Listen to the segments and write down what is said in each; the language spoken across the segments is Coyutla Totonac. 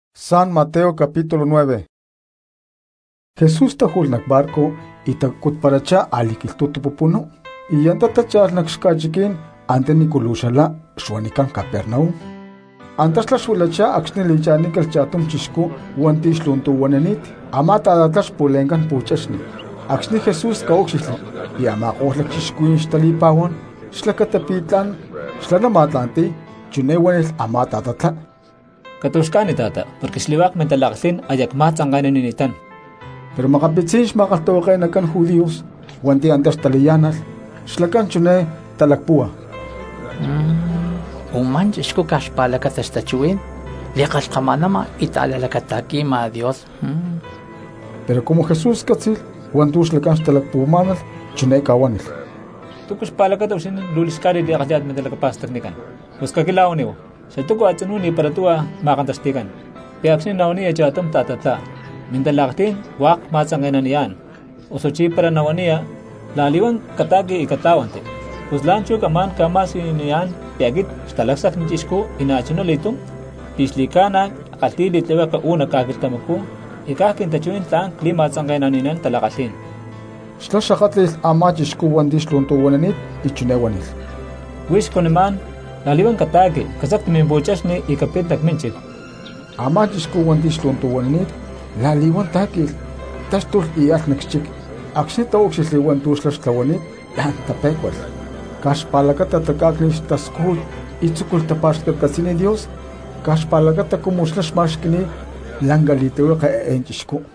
Pus huata Jesús táju̠lh nac barco y tacutparachá a̠li̠quilhtu̠tu pupunú, y antá tácha̠lh nac xca̠chiquí̠n antanícu luu xlama xuanicán Capernaum. Antá xlá xuilachá acxni̠ li̠cha̠nícalh cha̠tum chixcú hua̠nti̠ xlu̠ntu̠huanani̠t, a̠má ta̠tatlá pu̠chexni xpu̠le̠ncán. Acxni̠ Jesús ca̠úcxilhli pi̠ a̠ma̠ko̠lh lacchixcuhuí̠n xtali̠pa̠huán xlacata pi̠ tla̠n xlá nama̠tla̠nti̠y chiné huánilh a̠má ta̠tatlá: —Catu̠xca̠ni ta̠ta, porque xli̠hua̠k mintala̠kalhí̠n aya cma̠tzanke̠nanini̠tán. Pero makapitzí̠n xma̠kalhtahuake̠nacán judíos hua̠nti̠ antá xtalayá̠nalh xlacán chiné talacpúhua: “Umá chixcú caj xpa̠lacata xtachuhuí̠n li̠kalhkama̠nama y ta̠la̠lacata̠qui̠ma Dios.” Pero cumu Jesús cátzi̠lh hua̠ntu̠ xlacán xtalacpuhuamá̠nalh chiné ca̠huánilh: —¿Túcu xpa̠lacata huixinín luu li̠xcájnit li̠kalhi̠yá̠tit mintalacapa̠stacnicán? Pus caquila̠huaníhu, ¿xatúcu a̠tzinú ni̠para tuhua ma̠kantaxti̠cán, pi̠ acxni̠ nahuaniya cha̠tum ta̠tatlá: “Mintala̠kalhí̠n hua̠k cma̠tzanke̠naniyá̠n”, osuchí para nahuaniya: “La̠li̠huán cata̠qui y catlá̠huanti”? Pus la̠nchú camá̠n ca̠ma̠siyuniyá̠n pi̠ aquit Xatalacsacni Chixcú y na̠chuna li̠túm pi̠ xli̠ca̠na ckalhi̠y li̠tlihueke uú nac ca̠quilhtamacú y caj quintachuhuí̠n tla̠n cli̠ma̠tzanke̠nani̠nán tala̠kalhí̠n. Xlá xakátli̠lh a̠má chixcú hua̠nti̠ xlu̠ntu̠huanani̠t y chiné huánilh: —Huix cuanimá̠n, la̠li̠huán cata̠qui, casacti mimpu̠chexni y capit nac mínchic. Amá chixcú hua̠nti̠ xlu̠ntu̠huanani̠t la̠li̠huán tá̠qui̠lh, táxtulh y alh nac xchic. Acxni̠ a̠ma̠ko̠lh cristianos taúcxilhli hua̠ntu̠ xlá xtlahuani̠t la̠n tapé̠cualh caj xpa̠lacata tacá̠cni̠lh xtascújut y tzúculh tapa̠xcatcatzi̠niy Dios caj xpa̠lacata cumu xlá xma̠xqui̠ni̠t lanca li̠tlihueke eé chixcú.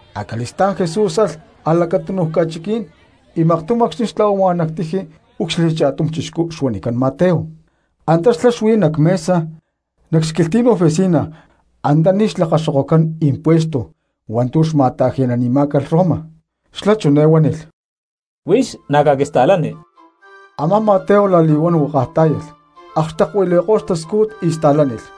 Acali̠stá̠n Jesús alh a̠lacatunu ca̠chiquí̠n y maktum acxni̠ xtla̠huama nac tiji úcxilhli cha̠tum chixcú xuanicán Mateo, antá xlá xuí nac mesa nac xquilhtí̠n oficina antaní xma̠lakaxoke̠nán impuestos hua̠ntu̠ xma̠ta̠ji̠nanimá̠calh Roma; xlá chiné huánilh: —Huix na̠ caquista̠lani. Amá Mateo la̠li̠huán huakaj tá̠yalh, akxtekuili̠ko̠lh xtascújut y sta̠lánilh.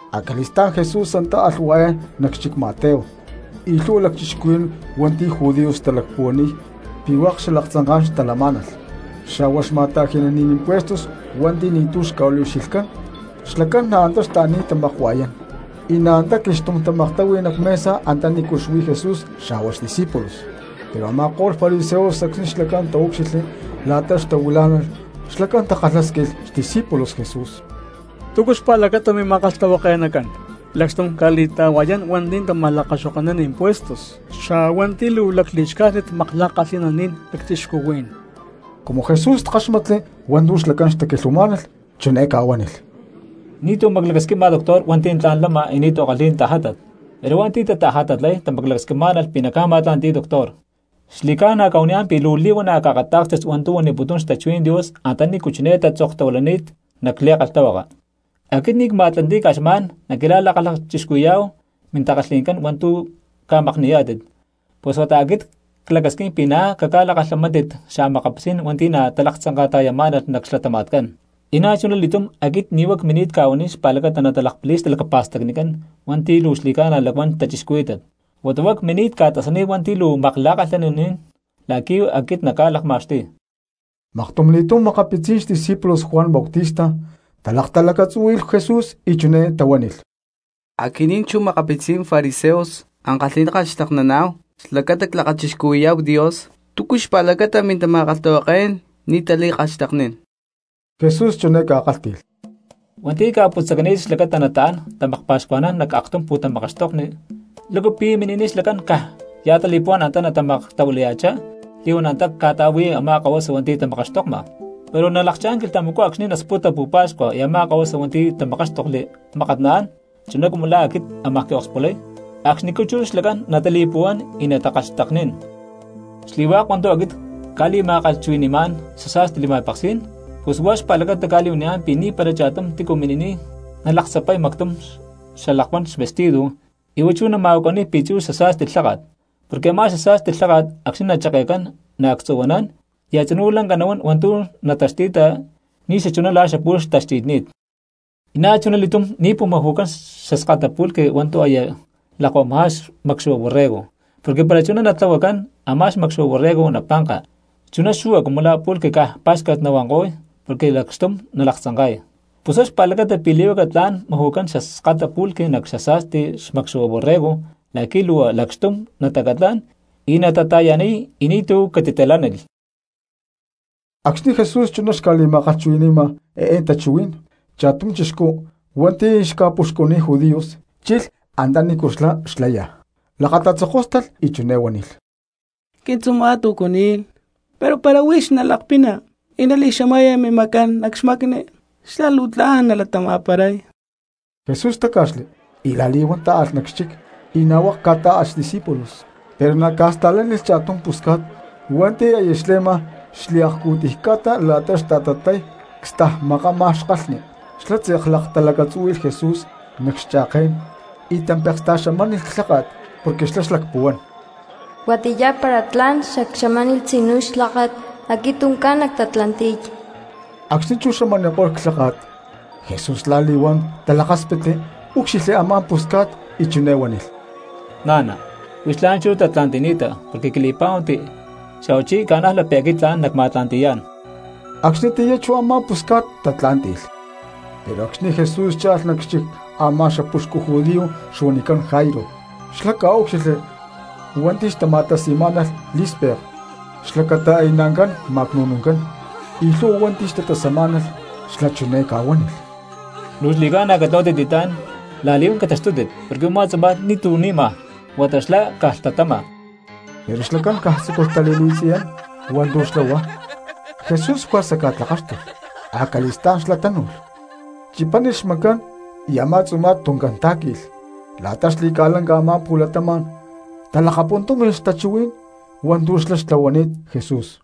Acali̠stá̠n Jesús antá alh hua̠yán nac xchic Mateo y na̠ luu lhu̠hua lacchixcuhuí̠n hua̠nti̠ judíos xtalacpuhuaniy pi̠ hua̠k xalaktzanká̠n xtalamá̠nalh, xa̠hua xma̠ta̠ji̠naní̠n impuestos hua̠nti̠ ni̠tu̠ xca̠liucxilhcán xlacán na̠ antá xtaani̠t tamakua̠yán, y na̠ antá quilhxtum tamaktahui nac mesa antaní xuí Jesús xa̠hua xdiscípulos. Pero a̠ma̠ko̠lh lacchixcuhuí̠n hua̠nti̠ xca̠huanicán fariseos acxni̠ xlacán taúcxilhli la̠ta xtahuilá̠nalh xlacán takalhásquilh xdiscípulos Jesús: —¿Túcu xpa̠lacata mima̠kalhtahuake̠nacán lacxtum ca̠li̠ta̠hua̠yán hua̠nti̠ tama̠lakaxoke̠nán impuestos, xa̠huá hua̠nti̠ luu lacli̠xcájnit makla̠kalhi̠naní̠n lacchixcuhuí̠n? Cumu Jesús káxmatli hua̠ntu̠ xlacán xtaquilhuamá̠nalh chiné ca̠huánilh: —Ni̠tu̠ maclacasquima doctor hua̠nti̠ tla̠n lama y ni̠tu̠ kalhi̠y tajátat, pero hua̠nti̠ tatajatatlay tamaclacasquimá̠nalh pi̠ naca̠ma̠tla̠nti̠y doctor. Xli̠ca̠na cca̠huaniyá̠n pi̠ luu li̠huana̠ caakatá̠kstit hua̠ntu̠ huaniputún xtachuhuí̠n Dios antanícu chiné tatzoktahuilani̠t nac li̠kalhtahuaka: “Aquit ni̠ cma̠tla̠nti̠y caj xma̠n naquila̠li̠lakachixcuhui̠yá̠hu mintakalhi̠ncán hua̠ntu̠ ca̠makni̠yá̠tit, pus huata aquit clacasquín pi̠ na̠ caca̠lakalhamántit xa̠makapitzí̠n hua̠nti̠ na̠ talaktzanka̠ta̠yamá̠nalh nac xlatama̠tcán.” Y na̠chuná li̠tum aquit ni̠ huá cmini̠t ca̠huaniy xlacata natalakpali̠y xtalacapa̠stacnicán hua̠nti̠ luu xli̠ca̠na lacuán cristianos, huata huá cmini̠t ca̠tasaniy hua̠nti̠ luu makla̠kalhi̠naní̠n la̠qui̠ aquit nacca̠lakma̠xtuy. Maktumli̠túm makapitzí̠n xdiscípulos Juan Bautista talaktalacatzúhui̠lh Jesús y chiné tahuánilh: —Aquinín chu makapitzín fariseos ankalhi̠ná ckalhxtekniná̠hu xlacata clakachixcuhui̠yá̠hu Dios, ¿túcu chú xpa̠lacata mintama̠kalhtahuaké̠n ni̠ tali̠kalhxteknín? Jesús chiné ca̠kálhti̠lh: —Hua̠nti̠ ca̠putzacani̠t xlacata nataán tamakpa̠xcuajnán nac aktum pu̠tamakaxtokni, ¿lácu pi̠ mini̠niy xlacán caj ya̠ tali̠puhuá̠n antá natamaklatahuilaya̠chá li̠huán antá ca̠ta̠láhui a̠má kahuasa hua̠nti̠ tamakaxtokma? Pero nalakchá̠n quilhtamacú acxni̠ nasputa pu̠pa̠xcua y a̠má kahuasa hua̠nti̠ tamakáxtokli mákat naán, chuná cumu la̠ aquit amaj quiokspulay, acxnicú chú xlacán natali̠puhuán y natakalhxteknín. ’Xli̠hua̠k hua̠ntu̠ aquit cca̠li̠ma̠kalhchuhui̠ni̠má̠n xasa̠sti li̠ma̠peksí̠n, pus huá xpa̠lacata cca̠li̠huaniyá̠n pi̠ ni̠para cha̠tum tícu mini̠niy nalaktzapay mactum xalakuán xvestido y huá chú nama̠huacaniy pi̠tzu̠ xasa̠sti lháka̠t, porque a̠má xasa̠sti lháka̠t acxni̠ nacheke̠cán naactzu̠huanán y a̠tzinú lanca nahuán hua̠ntu̠ nataxti̠ta ni̠xachuná la̠ xapu̠lh xtaxti̠tni̠t. Y na̠chuna li̠túm ni̠ pu̠maju̠cán xaskata pulque hua̠ntu̠ aya lakuama xmakxu̠hua borrego, porque para chuná natlahuacán, a̠má xmakxu̠hua borrego napanka, chuná xu̠hua cumu la̠ pulque caj pá̠xcat nahuanko̠y porque lacxtum nalaktzanka̠y. Pus huá xpa̠lacata pi̠ li̠huaca tla̠n maju̠cán xaskata pulque nac xasa̠sti xmakxu̠hua borrego la̠qui̠ luu lacxtum natacatlán y natata̠yaniy y ni̠tu̠ catitalánilh. Acxni̠ Jesús chuná xca̠li̠ma̠kalhchuhui̠ni̠ma eé tachuhuí̠n cha̠tum chixcú hua̠nti̠ xca̠puxcuniy judíos chilh antanícu xlá xlaya, lakatatzokóstalh nac xlacatí̠n y chiné huánilh: —Quintzuma̠t ucu ni̠lh pero para huix nalakpina y nali̠xamaya mimacán nac xmacni xlá luu tla̠n nalatama̠paray. Jesús táca̠xli y la̠li̠huán tá̠alh nac xchic, y na̠ hua̠k ca̠tá̠alh xdiscípulos. Pero na̠ ca̠sta̠lánilh cha̠tum pusca̠t hua̠nti̠ aya xle̠ma xliakcu̠tiy ca̠ta la̠ta xta̠tatlay cstajmakama xkalhni. Xlá tze̠k laktalacatzúhui̠lh Jesús nac xke̠n y tampeksta̠xamánilh clháka̠t, porque xlá xlacpuhuán: “Huatiyá para tla̠n xacxamánilh tzinú clháka̠t aquit tuncán nactatla̠nti̠y.” Acxni̠ chú xamaniko̠lh clháka̠t, Jesús la̠li̠huán talakáspitli úcxilhli a̠má pusca̠t y chiné huánilh: —Na̠na, huix la̠nchú tatla̠nti̠ni̠ta porque quili̠pá̠huanti xa̠huachí ca̠najla pi̠ aquit tla̠n nacma̠tla̠nti̠yá̠n. Acxnitiyá chú a̠má pusca̠t tatlá̠nti̠lh. Pero acxni̠ Jesús cha̠lh nac xchic a̠má xapuxcu judío xuanicán Jairo, xlá ca̠úcxilhli hua̠nti̠ xtama̠tasi̠má̠nalh lí̠spek xlacata aya naancán ma̠cnu̠nuncán, na̠chuná xli̠lhu̠hua cristianos xtatasamá̠nalh. Xlá chiné ca̠huánilh: —Luu xli̠ca̠na catlahuátit li̠tlá̠n la̠li̠huán cataxtútit porque u̠má tzuma̠t ni̠tu̠ ni̠ma huata xlá caj lhtatama. Pero a̠ma̠ko̠lh cristianos caj tzúculh tali̠li̠tziyán hua̠ntu̠ xlá huá. Jesús juerza ca̠tlakáxtulh, acali̠stá̠n xlá tánu̠lh, chipánilh xmacán y a̠má tzuma̠t tuncán tá̠qui̠lh; y la̠ta xli̠ca̠lanca a̠má pu̠latama̠n talakapuntúmi̠lh tachuhuí̠n hua̠ntu̠ xlá xtlahuani̠t Jesús.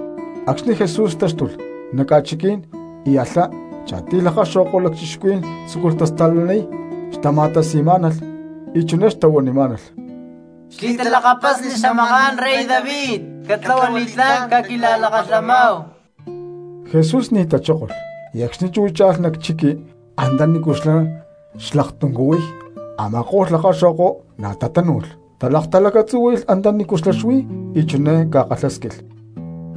Acxni̠ Jesús táxtulh nac ca̠chiquí̠n y alhá, cha̠tiy lakaxo̠kó̠n lacchixcuhuí̠n tzúculh tasta̠laniy xtama̠tasi̠má̠nalh y chiné xtahuanimá̠nalh: —Xli̠talakapasni xamaká̠n rey David, catlahua li̠tlá̠n, caquila̠lakalhamáhu. Jesús ni̠ tachókolh y acxni̠ chú cha̠lh nac chiqui antanícu xlá xlaktuncuhuiy, a̠ma̠ko̠lh lakaxo̠ko na̠ tatánu̠lh, talaktalacatzúhui̠lh antanícu xlá xuí y chiné ca̠kalhásquilh: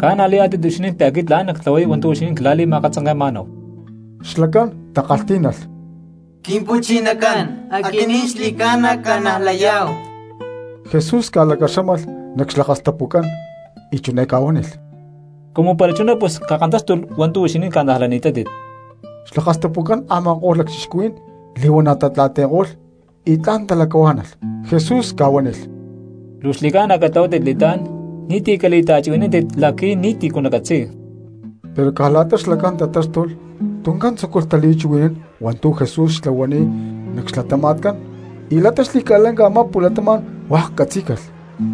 —¿Ca̠najlayá̠tit huixinín pi̠ aquit tla̠n nactlahuay hua̠ntu̠ huixinín quila̠li̠ma̠katzanke̠ma̠náhu? Xlacán takalhtí̠nalh: —Quimpu̠chinacán, aquinín xli̠ca̠na cca̠najlayá̠hu. Pus Jesús ca̠lacaxámalh nac xlakastapucán y chiné ca̠huánilh: —Cumu para chuná pus cakantáxtulh hua̠ntu̠ huixinín ca̠najlani̠tátit. Xlakastapucán a̠ma̠ko̠lh lacchixcuhuí̠n li̠huana̠ tatla̠nti̠ko̠lh y tla̠n talacahuá̠nalh. Jesús ca̠huánilh: —Luu xli̠ca̠na catlahuátit li̠tlá̠n ni̠ti̠ cali̠ta̠chuhui̠nántit la̠qui̠ ni̠tícu nacatzi̠y. Pero caj la̠ta xlacán tatáxtulh, tuncán tzúculh tali̠chuhui̠nán hua̠ntu̠ Jesús xtlahuani̠t nac xlatama̠tcán y la̠ta xli̠ca̠lanca a̠má pu̠latama̠n hua̠k catzí̠calh.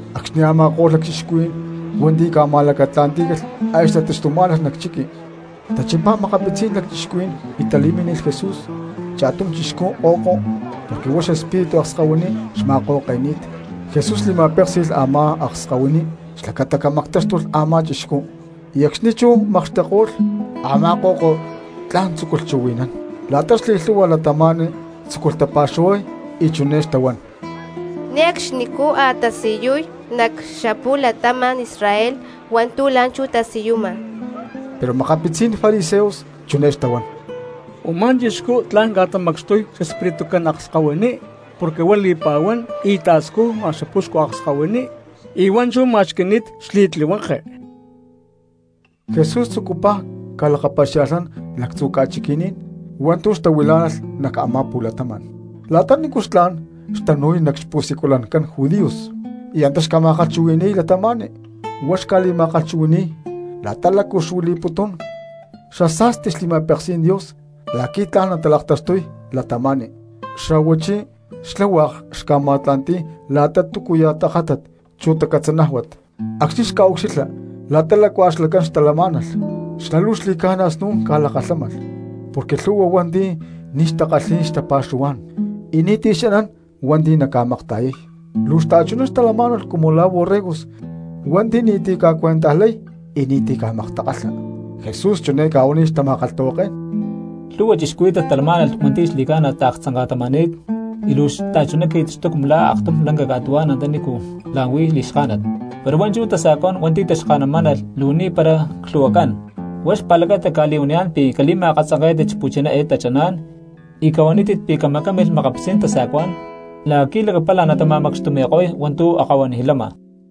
Acxni̠ a̠ma̠ko̠lh lacchixcuhuí̠n hua̠nti̠ ca̠ma̠lacatla̠ntí̠calh aya xtataxtumá̠nalh nac chiqui, tachimpá makapitzí̠n lacchixcuhuí̠n y tali̠mínilh Jesús cha̠tum chixcú ko̠ko porque huá xespíritu akskahuiní xma̠ko̠ke̠ni̠t. Jesús li̠ma̠péksi̠lh a̠má akskahuiní xlacata camactáxtulh a̠má chixcú, y acxni̠ chú makxtekko̠lh, a̠má ko̠ko tla̠n tzúculh chuhui̠nán. La̠ta xli̠lhu̠hua cristianos tzúculh tapa̠xuhuay y chiné xtahuán: —Ne̠cxnicú a̠ xtasiyuy nac xapu̠latama̠n Israel hua̠ntu̠ la̠nchú tasiyuma. Pero makapitzí̠n fariseos chiné xtahuán: —Umá chixcú tla̠n ca̠tamacxtuy xespiritucán akskahuiní porque huá li̠pa̠huán y ta̠scujma xapuxcu akskahuiní, y huá chú ma̠xqui̠ni̠t xli̠tlihueke. Jesús tzucupaj ca̠lakapaxia̠lhnán lactzu ca̠chiqui̠ní̠n hua̠ntu̠ xtahuilá̠nalh nac a̠má pu̠latama̠n; la̠ta nícu xcha̠n xtanu̠y nac xpu̠siculancán judíos y antá xca̠ma̠kalhchuhui̠ni̠y cristianos. Huá xca̠li̠ma̠kalhchuhui̠ni̠y la̠ta lácu xuili̠putún xasa̠sti xli̠ma̠peksí̠n Dios la̠qui̠ tla̠n natalaktaxtuy cristianos, xa̠huachí xlá hua̠k xca̠ma̠tla̠nti̠y la̠tachá túcuya̠ tajátat chu tacatzanájuat. Acxni̠ xca̠ucxilha lhu̠hua cristianos la̠ta lácua xlacán xtalamá̠nalh, xlá luu xli̠ca̠na snu̠n ca̠lakalhámalh porque lhu̠hua hua̠nti̠ ni̠ xtakalhi̠y xtapa̠xuhuá̠n y ni̠ti̠ xanán hua̠nti̠ naca̠makta̠yay. Luu xta̠chuná xtalamá̠nalh cumu la̠ borregos hua̠nti̠ ni̠ti̠ ca̠cuentajlay y ni̠ti̠ ca̠maktakalha. Jesús chiné ca̠huánilh xtama̠kalhtahuaké̠n: —Lhúhua cristianos talamá̠nalh hua̠nti̠ xli̠ca̠na taaktzanka̠tama̠ni̠t y luu xta̠chuná qui̠taxtuy cumu la̠ aktum lanca ca̠tuhuá̠n antanícu la̠n huí li̠xká̠nat, pero hua̠nchú tasa̠cuá̠n hua̠nti̠ taxka̠namá̠nalh luu ni̠para clhu̠huacán. Huá xpa̠lacata cca̠li̠huaniyá̠n pi̠ cali̠ma̠katzanké̠tit xpu̠chiná eé tachaná̠n y cahuanítit pi̠ camacámilh makapitzí̠n tasa̠cuá̠n la̠qui̠ lacapala natama̠macxtumi̠ko̠y hua̠ntu̠ akahuanij lama.